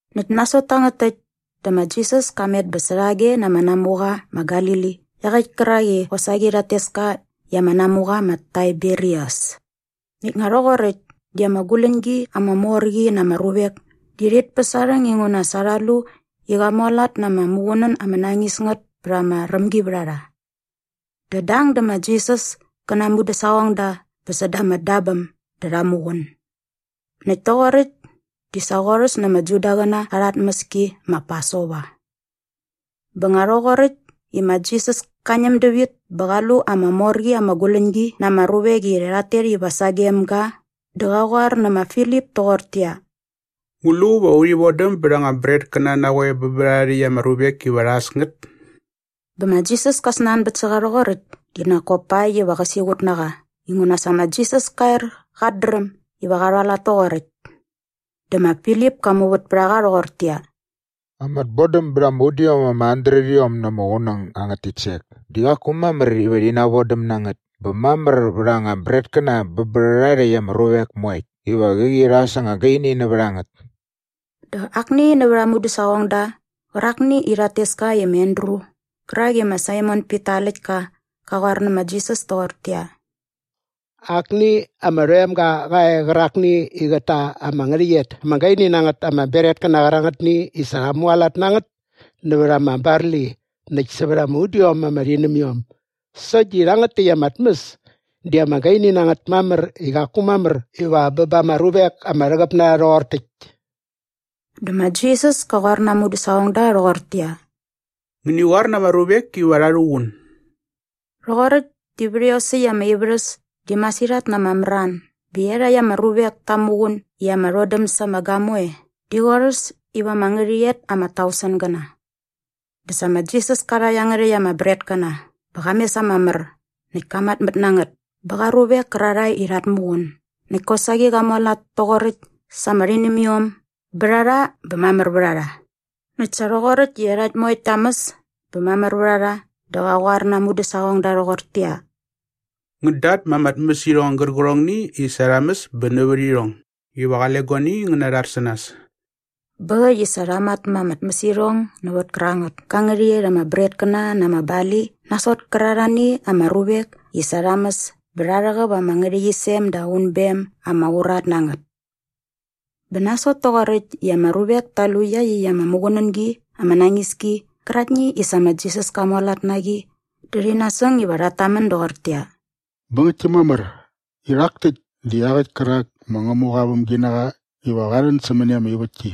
Näkt nasot tangät täkt dä ma Jisas ka met bä särhage na ama namuqa ma Galili iaqäkt kärak i qosaqi rhat tes ka i ama namuqa ma Taiberias. Näkt nga rhoqoräkt di ama guläñgi ama mor qi na ama ruvek di rhit päs aa rhäng inguna sa rha lu i qa mualat na ama muqunän ama nañis ngät pät ama rämgivärharha. Dä dang dä ma Jisas kä na aa mudäsaqongda bä säda ama dabäm dä rha muqun. Näkt toqoräkt di sa qorhäs na ama Judaqäna arha tmäski ma Pasova. Bä nga rhoqoräkt i ma Jisas ka ñäm dävit bä qa lu ama mor qi ama guläñgi na ama ruvek i rhat tet iva sagem ga dä qa qoar nä ma Filip toqortäqyia, “Ngu lu va urhi vodäm bät anga bretkäna na qoe bä bä rhärha rhäkt ama ruvek iva rha äs ngät?” Bä ma Jisas ka snanbät sä qa rhoqoräkt di nak kop pakt iva qä siqut na qa inguna sa ma Jisas ka er qat dräm iva qa rhualat toqoräkt. Dä ma Filip ka muvät pät a qa rhoqortäqyia, “Ama tbodäm bät ama udiom ama handretiom na ama qunäng angät titsek di qaku mamär iva rhi navodäm na ngät bä mamär vät anga bretkäna bä bä rhärha rhäkt ama ruvek moekt iva qäqi rha äs ama gaini nävät a ngät.” Dä akni nävät aa mudäsaqongda qärakni i rhat tes ka i ma Andru qärak i ma Saimon Pita aa läktka qa qoar nä ma Jisas toqortäqyia, “Akni ama rhoemga qa e qärakni i qät ta ama ngärhäqyet ama gaini na ngät ama bretkäna qärangätni i sa rha mualat na ngät nävät ama barli näkt sävät ama udiom ama rhinämiom sokt di rhangät täkt ama tmäs di ama gaini na ngät mamär i qaku mamär iva bä ba ama ruvek ama rhäqäp na rha rhoqor täkt.” Dä ma Jisas ka qoar na aa mudäsaqongda rhoqortäqyia, “Ngäni qoar na ama ruvek iva rha rhuqun.” Rhoqoräkt di vät iosäkt ama ivärhäs di masirhat na ama mran bä iarhakt ama ruvek ta muqun i ama rhodäm sa ama gamoe di qorhäs iva ama ngärhäqyet ama tausengäna. Dä sa ma Jisas ka rha iangärhäkt ama bretkäna bä qa mes ama mär näkt ka matmät na ngät bä qa ruvek kärarhae i rhat muqun näkt kosaqi qa mualat toqoräkt sa ama rhinämiom bä rha rha bä mamär vät a rha. Näkt sa rhoqoräkt i iarhakt moekt ta mäs bä mamär vät a rha dä qa qoar na aa mudäsaqongda rhoqortäqyia, “Ngän datma ama tmäsirhong gärqärhongni i sa rha mäs bä nävät irhong iva qale guani ngän narhar sä nas.” Bä äkt i sa rha matma ama tmäsirhong nävät kärangät ka ngärhäqyet ama bretkäna na ama barli nasot kärarhani ama ruvek i sa rha mäs bä rha rhäqäp ama ngärhäqyisem da unbem ama urat na ngät. Bä nasot toqoräkt i ama ruvek ta lu iaqyäkt ama muqunängi ama nañis ki qärakni i sa ma Jisas ka mualat na qi dä rhi nasäng iva rhat tamän doqortäqyia, “Bä ngäktki mamär i rhak täkt di iaqäkt kärak ma Ngämuqa aa vämginaqa iva qa rhän sämäni ama ivätki.”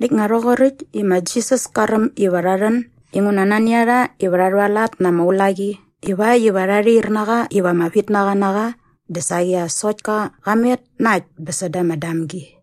Näkt nga rhoqoräkt i ma Jisas ka räm iva rha rhän inguna nani a rha iva rha rhualat na ama ulaqi ivakt iva rha rhair na qa iva ama vitnaqa na qa dä saqi as sokt ka qa met na äkt bä säda ama damgi.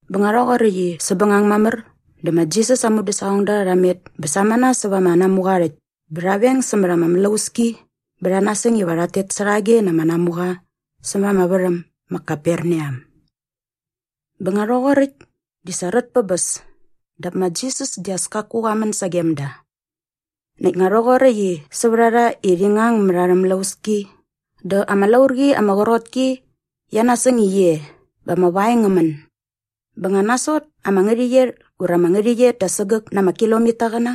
Bä nga rhoqoräkt i säpbängang mamär dä ma Jisas aa mudäsaqongda rha met bä samana säva ama namuqa aa rhäkt bä rha veng sämät ama mlauski bä rha nasäng iva rhat tet särhage na ama namuqa sämät ama värhäm ma Kaperneam. Bä nga rhoqoräkt di sa rät pä bäs dap ma Jisas di as kaku qa män sagem da. Näkt nga rhoqoräkt i sävät a rha i rhi ngang mät arhä mlauski dä ama laurqi ama qrot ki qia nasäng gi e bä ama vaeng ngä män. Bä nga nasot ama ngärhäqyet ura ama ngärhäqyet da sägäk na ama kilomitaqäna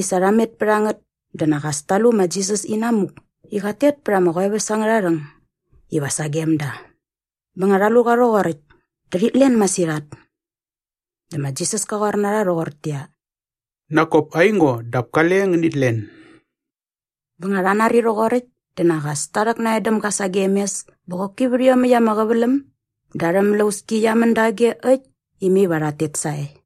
i sa rha met pät a ngät dä nak as ta lu ma Jisas i namuk i qat tet pät ama qoeväs angärha rhäng iva sagem da. Bä nga rha lu qa rhoqoräkt dä rhit len masirhat. Dä ma Jisas ka qoar na rha rhoqortäqyia, “Nak kop aingo dap kale ngänit len.” Bä nga rha nari rhoqoräkt dä nak as ta rhäknan däm ga sagem mes bä qoki vät iomäkt ama qäväläm dä arhä mlauski qia män dage äkt i mai iva rhat tet sae.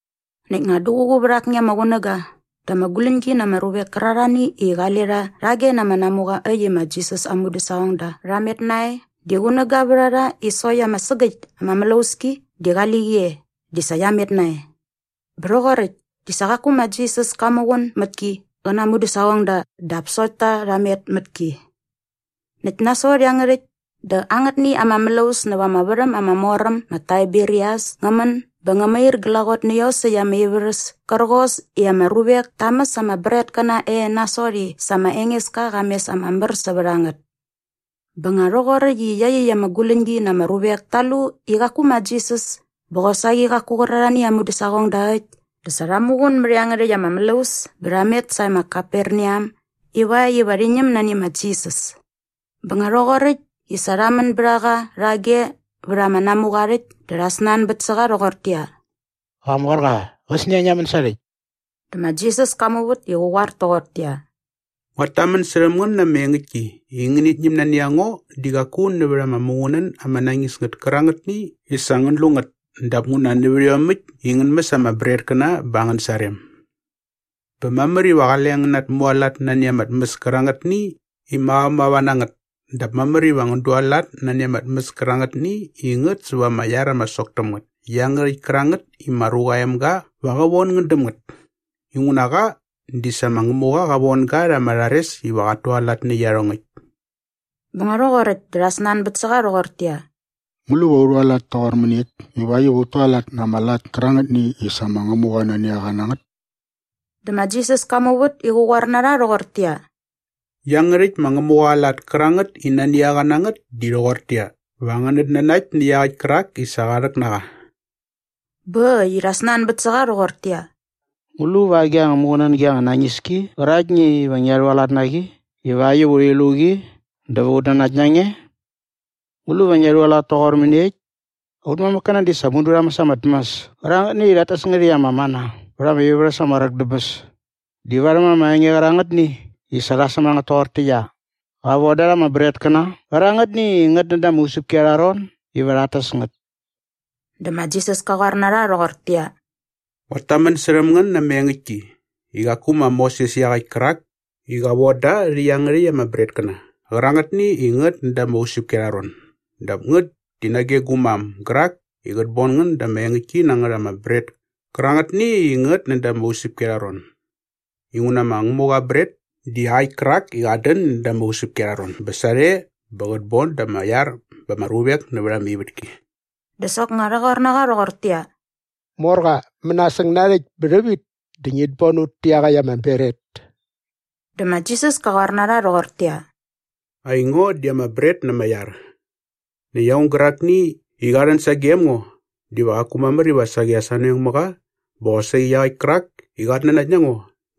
Näkt nga duququ vät akni ama qunäga dä ama guläñgi na ama ruvek kärarhani i qale rha rhage na ama namuqa äkt i ma Jisas aa mudäsaqongda rha met nae di qunäga vät a rha i sokt ama sägäkt ama mlauski di qali qi e di sa qia met nae. Bä rhoqoräkt di sa qaku ma Jisas ka muqun mät ki qä na aa mudäsaqongda dap sokt ta rha met mät ki. Näkt nasot iangärhäkt dä angätni ama mlaus näva ama värhäm ama mor äm ma Taiberias ngä män bä ngä mair glaqot nä iosäkt ama ivärhäs kärqos i ama ruvek ta mäs ama bretkäna e nasot i sa ma Engeska qa mes ama mär sävät a ngät. Bä nga rhoqoräkt i iaqyäkt ama guläñgi na ama ruvek ta lu i qaku ma Jisas bä qosaqi qaku qärarhani aa mudäsaqongda äkt dä sa rha muqun mät iangärhäkt ama mlaus bä rha met sae ma Kaperneam ivakt iva rhi ñäm nani ma Jisas. Bä nga rhoqoräkt i sa rha män bät a qa rhage vät ama namuqa aa rhäkt dä rha snanbät sä qa rhoqortäqyia, “Qamorqa, qäsnia ngia män sarhäkt?” Dä ma Jisas ka muvät i qä qoar toqortäqyia, “Nguat tamän särhäm ngän na ama engäktki i ngänit ñäm nani a ngo di qaku nävät ama muqunän ama nañis ngät kärangätni i sa ngän lu ngät dap nguna nävät iomäkt i ngän mäs ama bretkäna bä angän sarem. Bä mamär iva qale ngän natmualat nani ama tmäs kärangätni i mavamava na ngät dap mamär iva ngän dualat nani ama tmäs kärangätni i ngät säva ama iar ama sok täm ngät iangärhäkt kärangät i ma Ruqa aa Emga va qä von ngän däm ngät. Inguna qa di sa ma Ngämuqa qa von ga rha ama rhares iva qat tualat nä iarhongäkt.” Bä nga rhoqoräkt dä rha snanbät sä qa rhoqortäqyia, “Ngu lu va u rhualat toqor mäniekt ivakt iva ut tualat na ama lat kärangätni i sa ma Ngämuqa nani a qa na ngät?” Dä ma Jisas ka muvät i qä qoar na rha rhoqortäqyia, “Iangärhäkt ma Ngämuqa aa lat kärangät i nani a qa na ngät di rhoqortäqyia, va ngänät nanakt nä iaqäkt kärak i sa qa rhäk na qa.” Bä äkt i rha snanbät sä qa rhoqortäqyia, “Ngu lu va agi anga muqunängi anga nañis ki qäraktni iva ngia rhualat na qi ivakt iva urhi lu qi dä va ut nanakt na nge? Ngu lu va ngia rhualat toqor mäniekt? Aut mamäkkäna di sa mudu rha mäs ama tmäs kärangätni i rhat tes ngät i ama mana vät ama ivärhäs ama qräk dä bäs di varhäm ama enge qärangätni i sa rha säm a ngät toqortäqyia, ‘Qa von da rha ama bretkäna qärangätni i ngät näda ama usäpki arha ron iva rhat täs ngät.’” Dä ma Jisas ka qoar na rha rhoqortäqyia, “Nguat tamän särhäm ngän na ama engäktki i qaku ma Moses iaqäkt kärak i qa von da rhä iangärhäkt ama bretkäna qärangätni i ngät näda ama usäpki arha ron dap ngät di nage gu mam gärak i qät bon ngän da ama engäktki na ngät ama bret kärangätni i ngät näda ama usäpki arha ron. Inguna ma Ngämuqa aa bret di iaqäkt kärak i qat dän näda ama usäpki arha ron bä sarhe bä qät bon da ama iar bä ba ama ruvek nävät ama ivätki.” Dä soknga rha qoar na qa rhoqortäqyia, “Morqa, mänasäng narhäkt bä rhävit dä ngit bon ut tä iaqäkt ama bret.” Dä ma Jisas ka qoar na rha rhoqortäqyia, “Aingo di ama bret na ama iar. Näkt aung gärakni i qa rhän sagem ngo diva qaku mamär iva saqi as anoeng mä qa bä qosaqi iaqäkt kärak i qat nanakt na ngo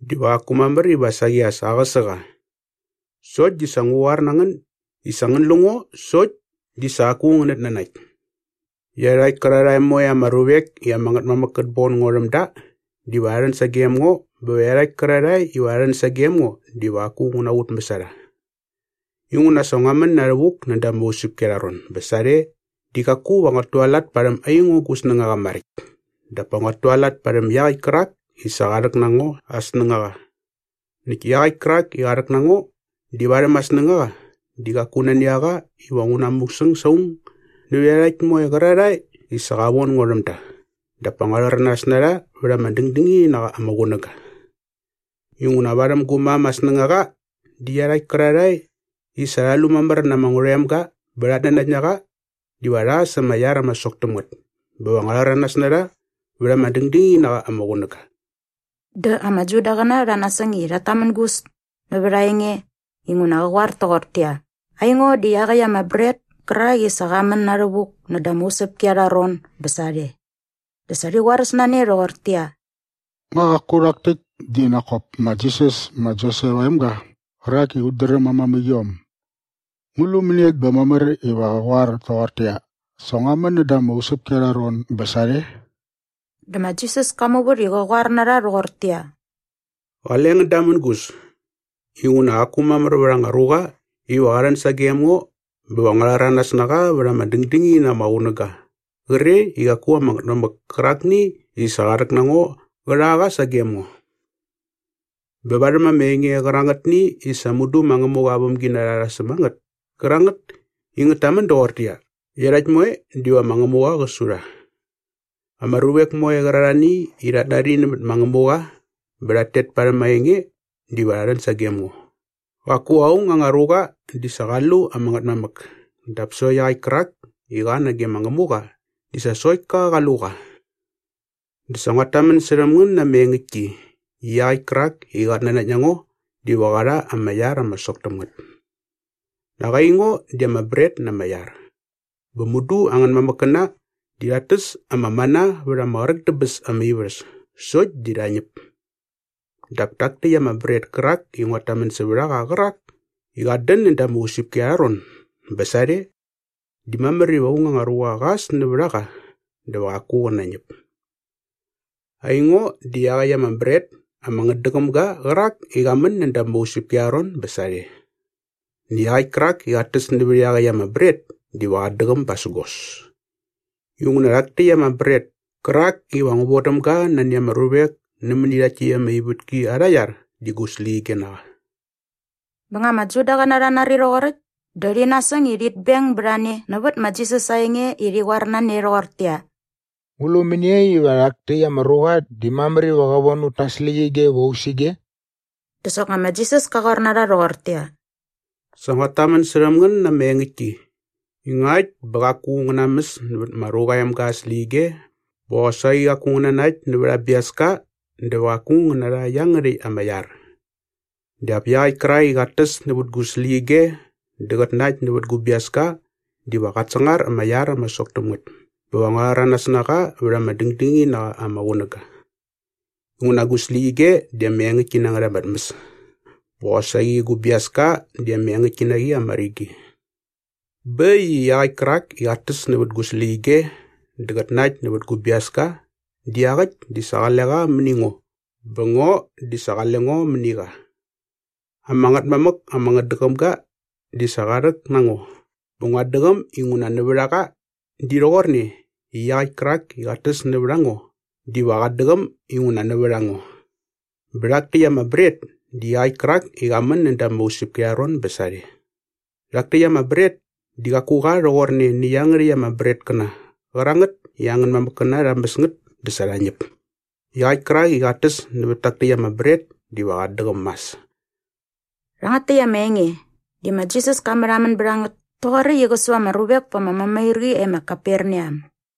diva qaku mamär iva saqi as aqäsä qa. Sokt di sa ngua qoar na ngän i sa ngän lu ngo sokt di sa qaku ngänät nanakt. Iarhakt kärarhae moe ama ruvek i ama Ngätmamäk kät bon ngo rhäm da diva rha rhän sagem ngo bä iarhakt kärarhae iva rha rhän sagem ngo diva qaku ngu naqutmäs a rha. “Inguna sa ngua män na rhävuk näda ama usäpki arha ron bä sarhe di qaku va nguat tualat parhäm aingo gu snängaqa maräkt dap pa nguat tualat parhäm iaqäkt kärak i sa qa rhäk na ngo aa snängaqa. Näkt iaqäkt kärak i qa rhäk na ngo di varhäm aa snängaqa di qaku nani a qa iva ngu namusäng sa aung nävät iarhakt moe qärarhae i sa qa von ngo rhäm da dap pa ngua rhäranas na rha vät ama dängdängini na qa ama qunäga. Inguna varhäm gu mam aa snängaqa di iarhakt kärarhae i sa rha lu mamär na ama Ngärhoemga bä rhat nanakt na qa diva rha sa ama iar ama sok täm ngät bä va ngua rhäranas na rha vät ama dängdängini na qa ama qunäga.” Dä ama Judaqäna rha nasäng i rhat tamängus nävät aa enge inguna qa qoar toqortäqyia, “Aingo di iaqäkt ama bret kärak i sa qa män na rhävuk näda ama usäpki arha ron bä sarhe.” Dä sa rhi qoaräs na ne rhoqortäqyia, “Nga qaku rhak täkt di nak kop ma Jisas ma Josep aa emga qärak i ut dräm aa mamäqiom? Ngu lu mäniekt bä mamär iva qä qoar toqortäqyia, ‘Sa ngua män näda ama usäpki arha ron bä sarhe?’” Dä ma Jisas ka muvät i qä qoar na rha rhoqortäqyia, “Qale ngän damängus. Inguna qaku mamär vät anga ruqa iva qa rhän sagem ngo bä va ngua rhäranas na qa vät ama dängdängini na qa ama qunäga qre i qaku ama Ngätmamäk kärakni i sa qa rhäk na ngo qä rha qa sagem ngo. Bä varhäm ama enge qärangätni i sa mudu ma Ngämuqa aa vämginarha rha säm a ngät kärangät i ngät tamän doqortäqyia, ‘Iarhakt moe diva ma Ngämuqa qä su rha.’ Ama ruvek moe qärarhani i rhat nari nämät ma Ngämuqa bä rhat tet parhäm aa enge diva rha rhän sagem ngo. “Qaku aung anga ruqa di sa qa lu ama Ngätmamäk dap sokt iaqäkt kärak i qa nage ma Ngämuqa di sa sokt ka qa lu qa. Dä sa nguat tamän särhäm ngän na ama engäktki i iaqäkt kärak i qat nanakt na ngo diva qä rha ama iar ama sok täm ngät. “Nak aingo di ama bret na ama iar. Bä mudu angän mamäkkäna di rhat täs ama mana vät ama qräk dä bäs ama ivärhäs sokt di rha ñäp. Dap tak täkt ama bret kärak i nguat tamän sävät a qa qärak i qat dän näda ama usäpki arha ron bä sarhe di mamär iva aung anga ruqa qa äs nävät a qa dä va qaku qä nañäp. Aingo di iaqäkt ama bret ama ngätdäqäm ga qärak i qa män näda ama usäpki arha ron bä sarhe. Näkt iaqäkt kärak i qat täs nävät iaqäkt ama bret diva qat däqäm basägos. Inguna rhak täkt ama bret kärak iva ngu vodäm ga nani ama ruvek nämäni rhakt täkt ama ivätki arha iar di gu släqyige na qa.” Bä nga ama Judaqäna rha nari rhoqoräkt dä rhi nasäng i rhit beng bät a ne nävät ma Jisas aa enge i rhi qoar na ne rhoqortäqyia, “Ngu lu mäniekt iva rhak täkt ama ruqa di mamär iva qä von ut ta aa släqyige iva u äs ige?” Dä soknga ma Jisas ka qoar na rha rhoqortäqyia, “Sa nguat tamän särhäm ngän na ama engäktki i ngakt bä qaku ngän namäs nävät ma Ruqa aa Emga aa släqyige bä qosaqi qaku ngän nanakt nävät aa biaska dä va qaku ngän narha iangärhäkt ama iar. Dap iaqäkt kärak i qat täs nävät gu släqyige dä qät nakt nävät gu biaska diva qat sangar ama iar ama sok täm ngät bä va ngua rhäranas na qa vät ama dängdängini na qa ama qunäga. Inguna gu släqyige di ama engäktki na ngät ama tmäs bä qosaqi gu biaska di ama engäktki na qi ama rigi. Bä äkt i iaqäkt kärak i qat täs nävät gu släqyige dä qät nakt nävät gu biaska di iaqäkt di sa qale qa mäni ngo bä ngo di sa qale ngo mäni qa. “Ama Ngätmamäk ama ngätdäqäm ga di sa qa rhäk na ngo bä nguat däqäm inguna nävät a qa di rhoqorne i iaqäkt kärak i qat täs nävät a ngo diva qat däqäm inguna nävät a ngo. Bä rhak täkt ama bret di iaqäkt kärak i qa män näda ama usäpki arha ron bä sarhe. Rhak täkt ama bret di qaku qa rhoqorne nä iangärhäkt ama bretkäna qärangät i angän mamäkkäna rha mäs ngät dä sa rha ñäp. Iaqäkt kärak i qat täs nävät tak täkt ama bret diva qat däqäm mas.” Rhangät täkt ama enge di ma Jisas ka märhamän bät a ngät toqoräkt i qä su ama ruvek pa ama mämairqi e ma Kaperneam.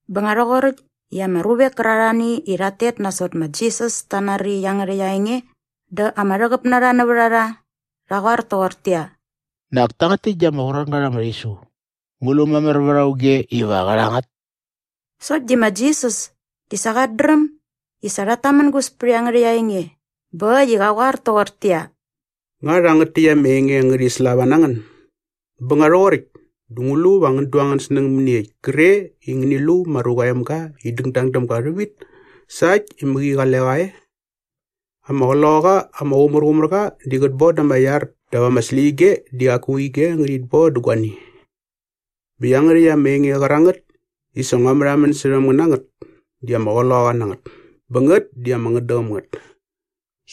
Bä nga rhoqoräkt i ama ruvek kärarhani i rhat tet nasot ma Jisas ta nari iangärhäkt aa enge dä ama rhäqäp na rha nävät a rha rha qoar toqortäqyia, “Nak tangät täkt di ama qrot ngät ama rhisu. Ngu lu mamär vät auge iva qä rha ngät?” Sokt di ma Jisas di sa qat dräm i sa rhat tamängus pät iangärhäkt aa enge bä äkt i qa qoar toqortäqyia, “Nga rhangät täkt ama enge ngärhi slava na ngän? Bä nga rhoqoräkt dä ngu lu vä ngän du angän snäng mäniekt kre i ngäni lu ma Ruqa aa Emga i dängdang däm ga rhävit sa äkt i mäqi qale qa e? Ama Qloqaqa ama Qumärqumärqa di qät boda ama iar dap ama släqyige di qaku ige ngärhit boda guani. Bä iangärhäkt ama enge qärangät i sa ngua märhamän särhäm ngän na ngät di ama qloqaqa na ngät bä ngät di ama ngätdäqäm ngät.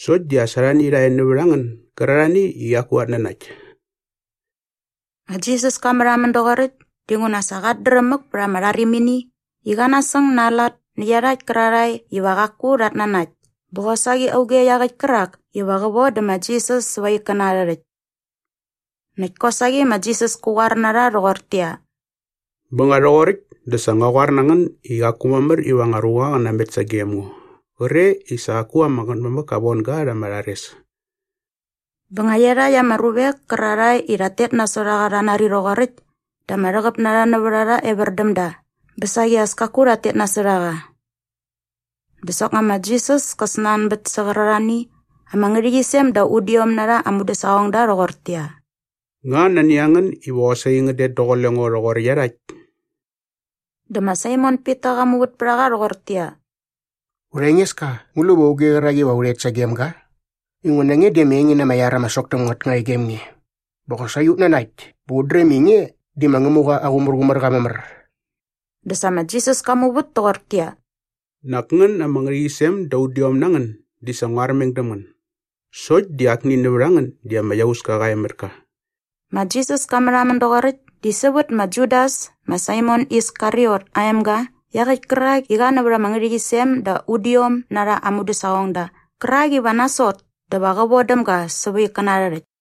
Sokt di as arhani rha e nävät a ngän gärarhani i qaku rhat nanakt.” Ma Jisas ka märhamän doqoräkt dinguna sa qat dräm mäk pät ama rharimini i qa nasäng na aa lat nä iarhakt kärarhae iva qaku rhat nanakt bä qosaqi auge iaqäkt kärak iva qä vodä ma Jisas säva aa ikkäna arhä rhäkt. Näkt kosaqi ma Jisas kä qoar na rha rhoqortäqyia, “Bä nga rhoqoräkt dä sa ngua qoar na ngän i qaku mamär iva anga ruqa qä namet sagem ngo qre i sa qaku ama Ngätmamäk ka von ga rha ama rhares.” Bä nga iarhakt ama ruvek kärarhae i rhat tet nasot a qa rha nari rhoqoräkt dä ama rhäqäp na rha nävät a rha evär däm da bä saqi as kaku rhat tet nasot a qa. Dä soknga ma Jisas ka snanbät sä qärarhani ama ngärhäqyisem da udiom na rha aa mudäsaqongda rhoqortäqyia, “Nga nani a ngän iva qosaqi ngän det daqule ngo rhoqor iarhakt?” Dä ma Saimon Pita qa muvät pät a qa rhoqortäqyia, “Urha Engeska, ngu lu va auge qärak iva u rhet sagem ga? Inguna nge di ama enge na ama iar ama sok täm ngät nga e gem nge. Bä qosaqi ut nanakt bä ut dräm i nge di ma Ngämuqa aa Qumärqumärqa mamär.” Dä sa ma Jisas ka muvät toqortäqyia, “Nak ngän ama ngärhäqyisem da udiom na ngän di sa ngua armeng däm ngän. Sokt di akni nävät a ngän di ama iauska qa e mät ka.” Ma Jisas ka märhamän doqoräkt di sävät ma Judas ma Saimon Iskariot aa emga iaqäkt kärak i qa nävät ama ngärhäqyisem da udiom na rha aa mudäsaqongda qärak iva nasot dä va qä von däm ga säva aa ikkäna arhä rhäkt.